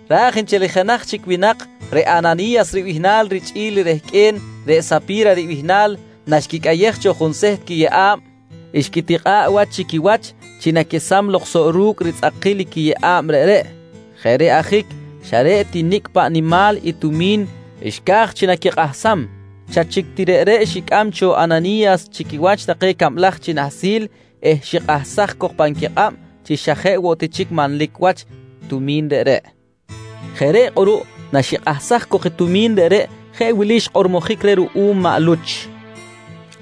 Raj nchel i jenaj chic winak reꞌ Anani̱yas ribihnal richꞌi̱l i rehqꞌue̱n reꞌ Sapi̱ra ribihnal, naxquicꞌayej cho junseht quiyeꞌa̱b xquitikꞌa̱ꞌ wach chi quiwach chi naquesam lok soꞌ ru̱cꞌ ritzꞌakil i quiyeꞌa̱b reꞌreꞌ. Jeꞌ reꞌ ajic xa reꞌ ti nicꞌ paꞌ nimal i tumi̱n xca̱j chi naquikꞌahsam, xa chic ti reꞌreꞌ xicꞌam cho Anani̱yas chi quiwach take cablaj chi nahsil eh xikꞌahsaj cok pan quikꞌab chi xa jeꞌ woꞌ ti chic manlic wach i tumi̱n reꞌreꞌ. Jeꞌ reꞌ kꞌuruꞌ naxikꞌahsaj cok i tumi̱n reꞌreꞌ jeꞌ wili xkꞌormojic reh ruꞌum maꞌ Luch: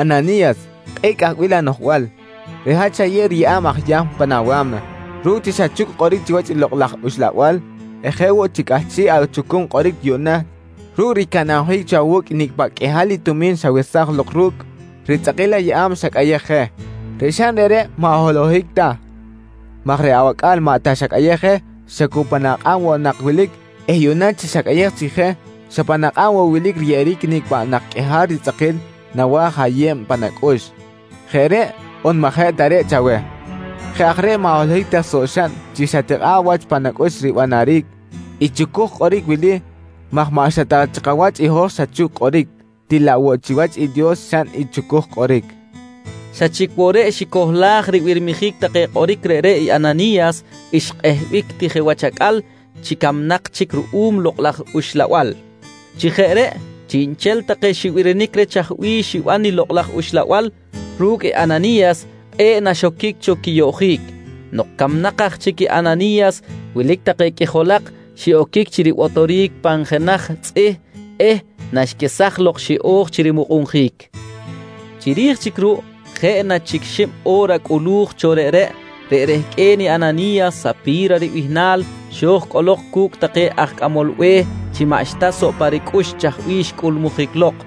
«Anani̱yas, kꞌe̱ꞌ cꞌahbil anoꞌjbal. Reꞌ hat xayew riyeꞌa̱b aj Yahm pan awa̱mna ru̱cꞌ chi xachuc kꞌoric chiwach i Lokꞌ laj Uxlabal eh jeꞌ woꞌ chi cꞌahchiꞌ achucum kꞌoric yuꞌna ru̱cꞌ ricanabjic cho awu̱cꞌ i nicꞌ paꞌ qꞌuihal i tumi̱n xawesaj lok ru̱cꞌ ritzꞌakil ayeꞌa̱b xacꞌayej je. Reꞌ xaꞌn reꞌreꞌ maꞌ holohic ta maj reꞌ awacꞌa̱l maꞌ ta xacꞌayej je, xa cu pan akꞌab woꞌ nak wilic eh yuꞌna chi xacꞌayej chic je, xa pan akꞌab woꞌ wilic riyeꞌeric i nicꞌ paꞌ nak qꞌuihal ritzꞌakil nawa̱j ayeb pan acꞌux. Jeꞌ reꞌ on maꞌ jeꞌ ta reꞌ chaweh? Jeꞌ aj reꞌ maꞌ holohic ta soꞌ xaꞌn chi xatikꞌa̱ꞌ wach pan acꞌux ribanaric i chucuj kꞌoric wili maj maꞌ xa ta chi kawach i hoj xachuc kꞌoric til laꞌ woꞌ chiwach i Dios xaꞌn i chucuj kꞌoric, nqui xkꞌormojic reh ruꞌum maꞌ Luch. Xa chic woꞌ reꞌ xicohlaj ribirmijic take kꞌoric reꞌreꞌ i Anani̱yas, xkꞌehbic ti je wach acꞌal chi camnak chic ruꞌum i Lokꞌ laj Uxlabal. Chi jeꞌ reꞌ chiꞌnchel take xibirinic reh chaj bih xiban i Lokꞌ laj Uxlabal ru̱cꞌ Anani̱yas, kꞌe̱ꞌ naxoquic cho quiyoꞌjic. Nok camnak aj chic i Anani̱yas, wilic take qꞌuijolak xiꞌoquic chi ribotoric pan jenaj tzꞌih eh naxquesaj lok xiꞌo̱j chi rimukꞌunjic. Chiri̱j chic ruꞌ jeꞌ na chic xib o̱ra cꞌulu̱j cho reꞌreꞌ, reꞌ rehqꞌue̱n Anani̱yas Sapi̱ra ribihnal, xo̱j cꞌolok cu̱cꞌ take aj cꞌamol be̱h chi maꞌxta soꞌ pa ricꞌux chaj bih xcꞌulmujic lok.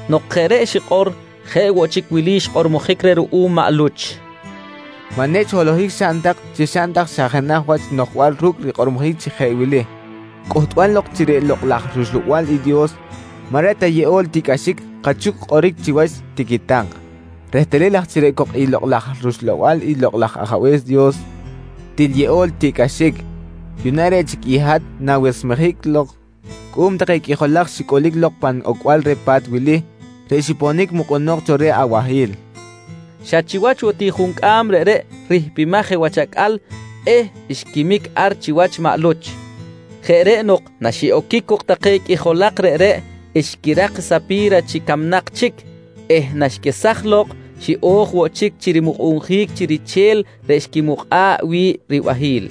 Nok jeꞌ reꞌ xikꞌor jeꞌ woꞌ chic wili xkꞌormojic reh ruꞌum maꞌ Luch: «Maꞌ nechꞌ holohic xaꞌn tak chi xaꞌn tak xa jenaj wach noꞌjbal ru̱cꞌ rikꞌormojic chi jeꞌ wili: ‹Cꞌuhtbal lok chi reꞌ Lokꞌ laj rUxlabal i Dios maꞌ reꞌ ta yeꞌol tiꞌcꞌaxic kachuc kꞌoric chiwach, tiqui tak. «Rehtalil aj chi reꞌ cok i Lokꞌ laj rUxlabal i Lokꞌ laj Ajabe̱s Dios til yeꞌol tiꞌcꞌaxic, yuꞌna reꞌ chic i hat na̱wesmejic lok cuꞌum take qꞌuijolak xicꞌulic lok pan ocbal reh pa̱t wili, reꞌ xiponic mukꞌunok cho reh abahi̱l, nqui xkꞌormojic reh. Xa chiwach woꞌ ti juncꞌam reꞌreꞌ rihpimaj je wach acꞌal eh xquimic ar chiwach maꞌ Luch. Jeꞌ reꞌ nok naxiꞌoquic cok take qꞌuijolak reꞌreꞌ, xquirak i Sapi̱ra chi camnak chic eh naxquesaj lok xiꞌo̱j woꞌ chic chi rimukꞌunjic chi riche̱l reꞌ xquimukꞌa̱ꞌ wi̱ꞌ ribahi̱l.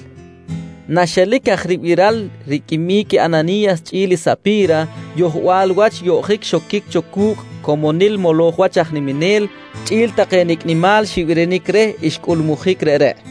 Naxelic aj ribiral riquimic i Anani̱yas chꞌi̱l i Sapi̱ra, yohbal wach yoꞌjic xoquic cho cu̱cꞌ comonil moloj wach aj niminel, chꞌi̱l take nicꞌ nimal xibirinic reh xcꞌulmujic reꞌreꞌ.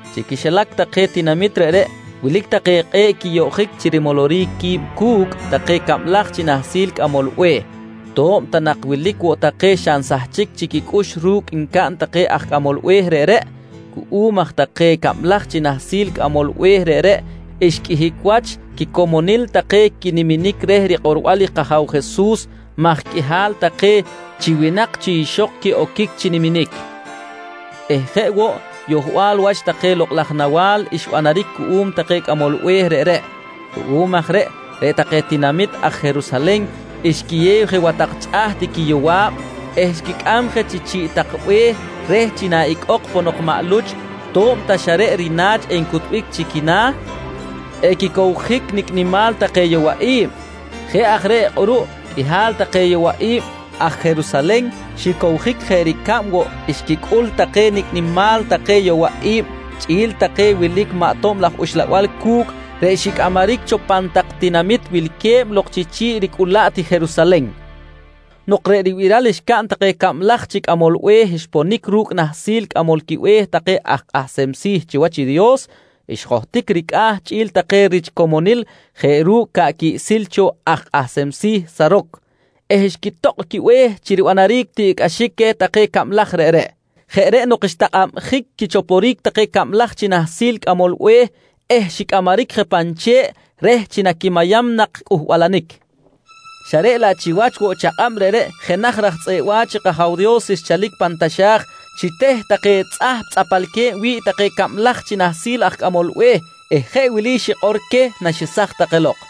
Chi quixilac take tinamit reꞌreꞌ wilic take kꞌe̱ꞌ quiyoꞌjic chi rimoloric qui̱b cu̱cꞌ take cablaj chi nahsil aj cꞌamol be̱h, to̱b ta nak wilic woꞌ take xa nsahchic chic quicꞌux ru̱cꞌ ncaꞌn take aj cꞌamol be̱h reꞌreꞌ. Cuꞌum aj take cablaj chi nahsil cꞌamol be̱h reꞌreꞌ xqꞌuihic wach quicomonil take quiniminic reh rikꞌorbal kAja̱w Jesus maj qꞌuihal take chi winak chi ixok quiꞌoquic chi niminic eh jeꞌ woꞌ yohbal wach take lokꞌ laj nawa̱l xbanaric cuꞌum take cꞌamol be̱h reꞌreꞌ. Ruꞌum aj reꞌ, reꞌ take tinamit aj Jerusalen xquiyew je wach tak chꞌaht i quiyowa̱b eh xquicꞌam je chi chi̱ꞌ tak be̱h reh chi na icꞌok ponok maꞌ Luch to̱b ta xa reꞌ rina̱ch encutbic chi quina̱, equicowjic nicꞌ nimal take yowaꞌi̱b. Jeꞌ aj reꞌ kꞌuruꞌ qꞌuihal take yowa̱b i̱b aj Jerusalen xicowjic jeꞌ ricab woꞌ xquicꞌul take nicꞌ qꞌuihal take yowaꞌi̱b chꞌi̱l take wilic maꞌ tob laj uxlabal cu̱cꞌ reꞌ xicꞌamaric cho pan tak tinamit wilque̱b lok chiꞌ ricꞌulaꞌt i Jerusalen. Nok reꞌ ribiral xcaꞌn take cablaj chi cꞌamol be̱h xponic ru̱cꞌ nahsil cꞌamol quibe̱h take aj kꞌahsem si̱ chiwach i Dios, xjohtic ricꞌa̱ chꞌi̱l take rich ricomonil jeꞌ ru̱cꞌ ca̱ꞌ quiꞌsil cho aj kꞌahsem si̱ Saroc eh xquitokꞌ quibe̱h chi ribanaric tiꞌcꞌaxic queh cablaj reꞌreꞌ. Jeꞌ reꞌ nok xtakꞌabjic quichoporic take cablaj chi nahsil aj cꞌamol be̱h eh xicꞌamaric je pan che̱ꞌ reh chi naquimayam nak cꞌuhbalanic. Xa reꞌ laꞌ chiwach woꞌ chakꞌab reꞌreꞌ jenaj aj tzꞌeꞌ wa̱ch i kAja̱w Dios nchalic pan taxa̱j xiteh take tzꞌahp tzꞌapalque̱b wi̱ꞌ take cablaj chi nahsil aj cꞌamol be̱h eh jeꞌ wili xikꞌor queh naxesaj take lok: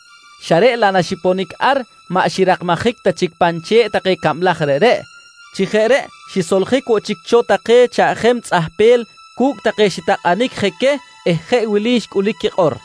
xa reꞌ laꞌ naxiponic ar maꞌ xirakmajic ta chic pan che̱ꞌ take cablaj reꞌreꞌ. Chi jeꞌ reꞌ xisoljic woꞌ chic cho take chaꞌjem tzꞌahpel cu̱cꞌ take xitakꞌanic je queh eh jeꞌ wili xcꞌulic quikꞌor: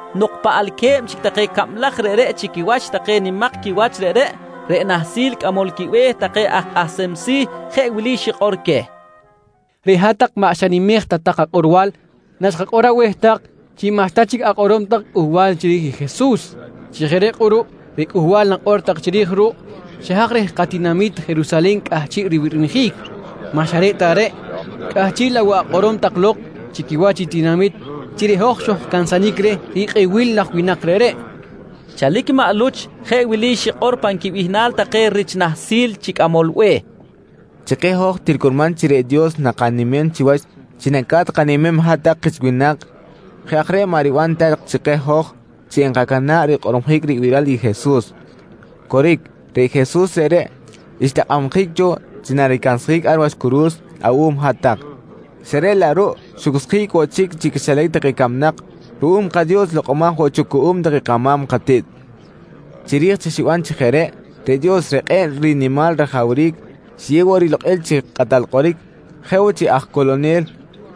Nok paꞌalque̱b chic take cablaj reꞌreꞌ chi quiwach take nimak quiwach reꞌreꞌ, reꞌ nahsil cꞌamol quibe̱h take aj kꞌahsem si̱ jeꞌ wili xikꞌor queh: «Reꞌ hat-tak maꞌ xanimej ta tak kakꞌorbal naxkakꞌor aweh tak chi maꞌxta chic akꞌorom tak cꞌuhbal chiri̱j i Jesus. Chi jeꞌ reꞌ kꞌuruꞌ reꞌ Cꞌuhbal nakꞌor tak chiri̱j ruꞌ, xa haj reh katinami̱t Jerusalen cꞌahchiꞌ ribirmijic. Maꞌ xa reꞌ ta reꞌ, cꞌahchiꞌ laꞌ woꞌ akꞌorom tak lok chi quiwach i tinamit chi reꞌ hoj xojcansanic reh rikꞌebil laj winak reꞌreꞌ, nqui nahsil aj kꞌahsem si̱. Chalic maꞌ Luch jeꞌ wili xikꞌor pan quibihnal take rich nahsil chi cꞌamol be̱h: «Chi keh hoj til curman chi reꞌ Dios nakanimem chiwach chi naca̱t kanimem hat-tak kich winak. Jeꞌ aj reꞌ maꞌ riban ta chi keh hoj chi enkacana̱ꞌ rikꞌormojic ribiral i Jesus. Coric, reꞌ Jesus reꞌreꞌ xtakꞌabjic cho chi naricansjic ar wach curu̱s awuꞌum hat-tak, xa reꞌ laꞌ ruꞌ xucsjic woꞌ chic chi quixilac take camnak ruꞌum kaDios lokꞌomaj woꞌ cho cuꞌum take kama̱m katiꞌt. Chiri̱j chi xiban chi jeꞌ reꞌ, reꞌ Dios reꞌ kꞌe̱ꞌ rinimal rajawric, xiyew woꞌ rilokꞌil chi Kꞌatal Kꞌoric jeꞌ woꞌ chi Aj Coꞌlonel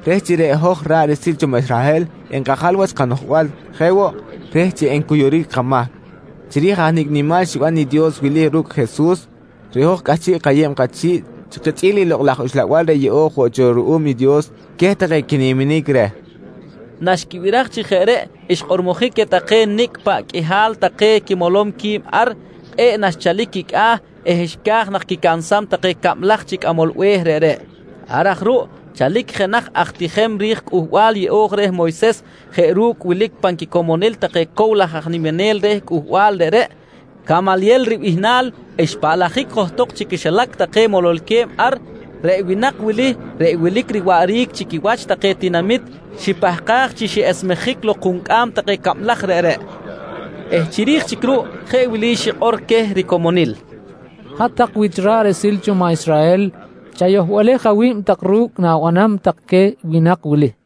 reh chi reꞌ hoj ra̱ꞌ riꞌsil cho maꞌ Israhel enkajal wach kanoꞌjbal jeꞌ woꞌ, reh chi encuyuric kamahc. Chiri̱j aj nicꞌ nimal xiban i Dios wili ru̱cꞌ Jesus, reꞌ hoj cꞌahchiꞌ kayeb kachi̱ꞌ chi kichꞌi̱l i Lokꞌ laj Uxlabal reꞌ yeꞌo̱j woꞌ cho ruꞌum i Dios queh take quiniminic reh, nqui maꞌ Luch. Naxquibiraj chi jeꞌ reꞌ xkꞌormojic queh take nicꞌ paꞌ qꞌuihal take quimolom qui̱b ar, kꞌe̱ꞌ naxchalic quicꞌa̱ eh xca̱j nak quicansam take cablaj chi cꞌamol be̱h reꞌreꞌ. Ar aj ruꞌ chalic jenaj aj tijem ri̱j Cꞌuhbal Yeꞌo̱j reh Moyses jeꞌ ru̱cꞌ wilic pan quicomonil take cow laj aj niminel reh cꞌuhbal reꞌreꞌ, Camalyel ribihnal xpaꞌlajic johtok chi quixilac take mololque̱b ar. Reꞌ winak wili reꞌ wilic riwaꞌric chi quiwach take tinamit xipahkaj chi xiꞌesmejic lok juncꞌam take cablaj reꞌreꞌ eh chiri̱j chic ruꞌ jeꞌ wili xikꞌor queh ricomonil: «Hat-tak wich ra̱ꞌ riꞌsil cho maꞌ Israhel, chayohbalej awi̱b tak ru̱cꞌ na̱banam tak queh winak wili.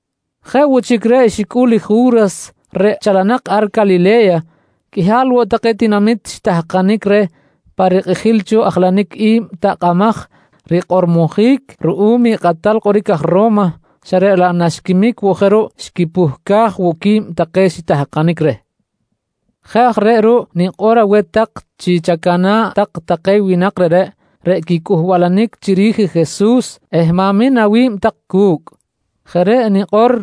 Jeꞌ woꞌ chic reꞌ xicꞌul i Ju̱ras reꞌ chalanak ar Calile̱ya, qꞌuihal woꞌ take tinamit xitahkanic reh pa rikꞌijil cho ajlanic i̱b takꞌamaj rikꞌormojic ruꞌum i kꞌatal kꞌoric aj Ro̱ma xa reꞌ laꞌ naxquimic woꞌ je ruꞌ, xquipuhcaj woꞌ qui̱b take xitahkanic reh. Jeꞌ aj reꞌ ruꞌ nikꞌor aweh tak chi chacana̱ꞌ tak take winak reꞌreꞌ, reꞌ quicꞌuhbalanic chiri̱j i Jesus eh ma̱min awi̱b tak cu̱cꞌ. Jeꞌ reꞌ nikꞌor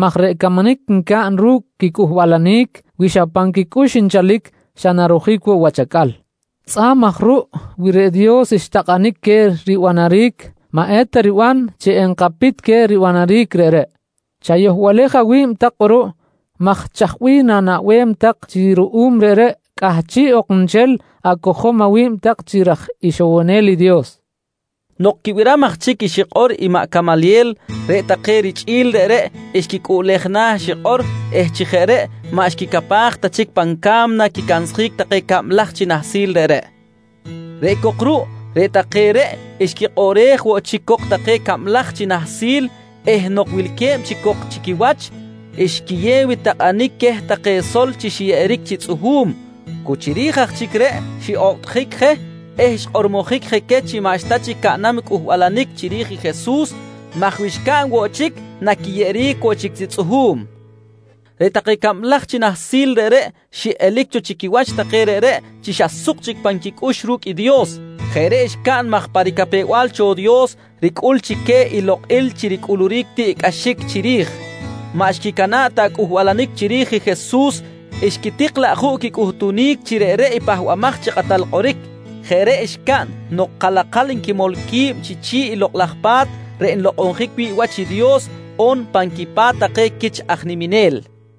maj reꞌ camanic ncaꞌn ru̱cꞌ quicꞌuhbalanic, wi xa pan quicꞌux nchalic xa narojic woꞌ wach acꞌal. Tzꞌa̱b aj ruꞌ wi reꞌ Dios xtakꞌanic queh ribanaric, maꞌeta riban chi enkapit queh ribanaric reꞌreꞌ. Chayohbalej awi̱b tak kꞌuruꞌ maj chaj bih na̱naꞌbem tak chi ruꞌum reꞌreꞌ, cꞌahchiꞌ ok nchel acojom awi̱b tak chi raj ixowonel i Dios? nqui xikꞌor queh richꞌi̱l. Nok quibiram aj chic i xikꞌor i maꞌ Camalyel, reꞌ take richꞌi̱l reꞌreꞌ xquicꞌuꞌlej na̱ xikꞌor eh chi jeꞌ reꞌ maꞌ xquicapaj ta chic pan ca̱mna quicansjic take cablaj chi nahsil reꞌreꞌ. Reꞌ cok ruꞌ, reꞌ take reꞌ xquikꞌoꞌrej woꞌ chic cok take cablaj chi nahsil eh nok wilque̱b chic cok chi quiwach, xquiyew i takꞌanic queh take sol chi xiyeꞌeric chi tzꞌuhu̱m. Cu chiri̱j aj chic reꞌ, xiꞌokꞌtjic je eh xkꞌormojic je queh chi maꞌxta chic caꞌnam cꞌuhbalanic chiri̱j i Jesus maj wi xcaꞌn woꞌ chic naquiyeꞌeric woꞌ chic chi tzꞌuhu̱m. Reꞌ take cablaj chi nahsil reꞌreꞌ xiꞌelic cho chi quiwach take reꞌreꞌ chi xa suk chic pan quicꞌux ru̱cꞌ i Dios. Jeꞌ reꞌ xcaꞌn maj pa ricapew-bal cho Dios ricꞌul chi queh i lokꞌil chi ricꞌuluric tiꞌcꞌaxic chiri̱j, maꞌ xquicana̱ꞌ ta cꞌuhbalanic chiri̱j i Jesus xquitik laꞌ juꞌ quicꞌuhtunic chi reꞌreꞌ i Pahbamaj chi Kꞌatal Kꞌoric. Jeꞌ reꞌ xcaꞌn nok kalakal nquimol qui̱b chi chi̱ꞌ i Lokꞌ laj Pa̱t reꞌ nlokꞌonjic wi̱ꞌ wach i Dios on pan quipa̱t take quich aj niminel.